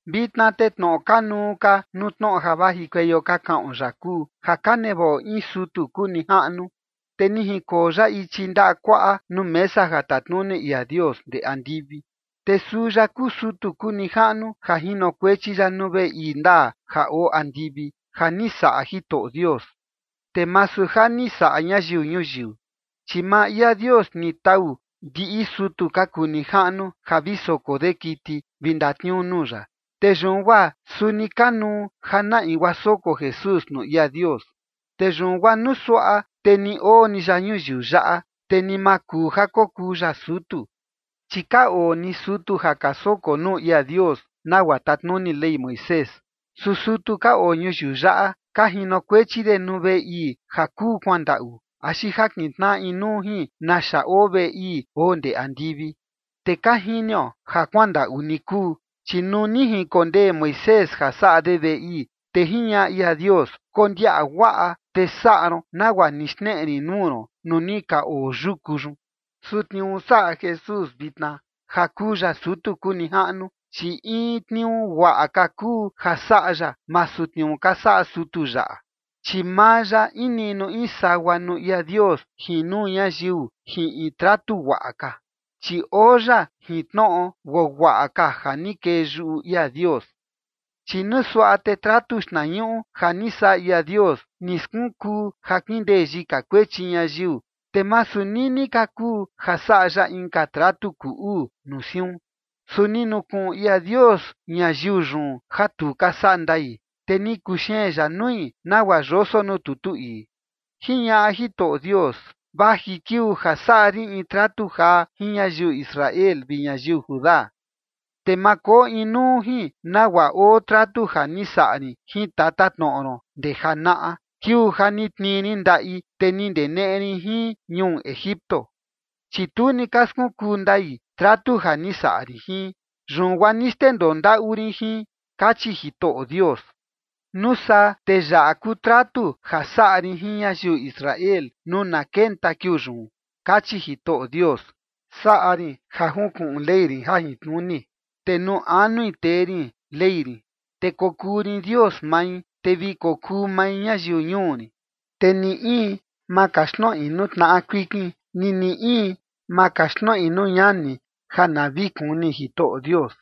Vitna te tnoꞌo kanuu ka nuu tnoꞌo ja vajikueio ka kaꞌon yaꞌa kuu ja ka nevaꞌo in sutu kuu nijaꞌnu, te ni jinkoo ya ichi ndaꞌa kuaꞌa nuu mesa ja tatnuni ia Dios ndee andivi. Te suu ya kuu sutu kuu nijaꞌnu ja jinokuechi ya nuu veꞌe ii ndaa ja oo andivi ja ni saꞌa Jitoꞌo Dios, te masu ja ni saꞌa ñayiu ñuyiu. Chi maa ia Dios ni tau ndiꞌi sutu ka kuu nijaꞌnu ja vi soko de kiti vi ndatniuu nuu ya, te yun guaa suni kanuu ja na in guaa soko Jesús nuu ia Dios. Te yun guaa nuu suaꞌa te ni oo ni ya ñuyiu yaꞌa, te ni ma kuu ja kokuu ya sutu, chi ka oo ni sutu ja ka soko nuu ia Dios nagua tatnuni Ley Moisés. Su sutu ka oo ñuyiu yaꞌa ka jinokuechi de nuu veꞌe ii ja kuu kuandaꞌu axi ja kintnaꞌa inuu jin naxa oo veꞌe ii oo ndee andivi. Te ka jinio ja kuandaꞌu ni kuu, chi nuu ni jinkondee Moisés ja saꞌa de veꞌe ii, te jiñaꞌa ia Dios: “Kondiaꞌa guaꞌa te saꞌa ron nagua ni xneꞌe rin nuu ron nuu ni ka oo yuku yun”. Su tniuu saꞌa Jesús vitna, ja kuu ya sutu kuu nijaꞌnu, chi in tniuu guaꞌa ka kuu ja saꞌa ya, masu tniuu ka saꞌa sutu yaꞌa, chi maa ya in niꞌnu in sagua nuu ia Dios jin nuu ñayiu jin in tratu guaꞌa ka, chi oo ya jin tnoꞌo guaguaꞌa ka ja ni kee yuꞌu ia Dios. Chi nuu suaꞌa te tratu xtnañuꞌu ja ni saꞌa ia Dios ni skunkuu ja kindee yika kuechi ñayiu, te masu nini ka kuu ja saꞌa ya inka tratu kuu uu nuu siun. Su ni nukuꞌun ia Dios ñayiu yun ja tu ka saꞌa ndai, te ni kuxeen ya nui, nagua yoso nuu tutu ii: Jiñaꞌa Jitoꞌo Dios: Vaji kiuu ja saꞌa rin in tratu jaa jin ñayiu Israel vi ñayiu Judá. Te ma koo inuu jin nagua oo tratu ja ni saꞌa rin jin tatatnoꞌo ron ndee janaꞌa, kiuu ja ni tnii rin ndaꞌi, te ni ndeneꞌe rin jin ñuu Egipto, chi tu ni ka skunkuu ndai tratu ja ni saꞌa rin jin, yun guaa ni xndendoo ndaꞌu rin jin, kachi Jitoꞌo Dios. Nuu saa te yaꞌa kuu tratu ja saꞌa rin jin ñayiu Israel nuu na kenta kiuu yun, kachi Jitoꞌo Dios, Saꞌa rin ja junkuꞌun Ley rin jajintnuni, te nuu anui tee rin Ley rin, te kokuu rin Dios mai, te vi kokuu mai ñayiu ñuu rin. Te ni in, ma kaxtnoꞌi nuu tnaꞌa kuikin, ni ni in, ma kaxtnoꞌi nuu ñani ja na vi kuni Jitoꞌo Dios,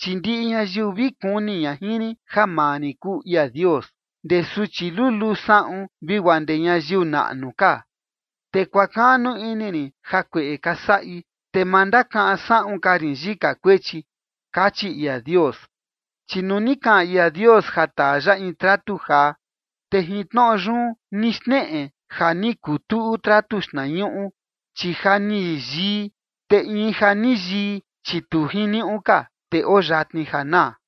chi ndiꞌi ñayiu vi kuni ña jin rin ja maa rin kuu ia Dios, ndee suchi luluu saꞌun vi guaa ndee ñayiu naꞌnu ka. Te kuakaꞌnu ini rin jakueꞌe ka saꞌi, te ma ndakaꞌan saꞌun ka rin yika kuechi, kachi ia Dios. Chi nuu ni kaꞌan ia Dios ja taa ya in tratu jaa, te jin tnoꞌo yun ni xneꞌe ja ni kuu tuꞌu tratu xtnañuꞌu, chi ja ni yii. Te in ja ni yii, chi tu jiniuꞌu ka, te oo yatni ja naa.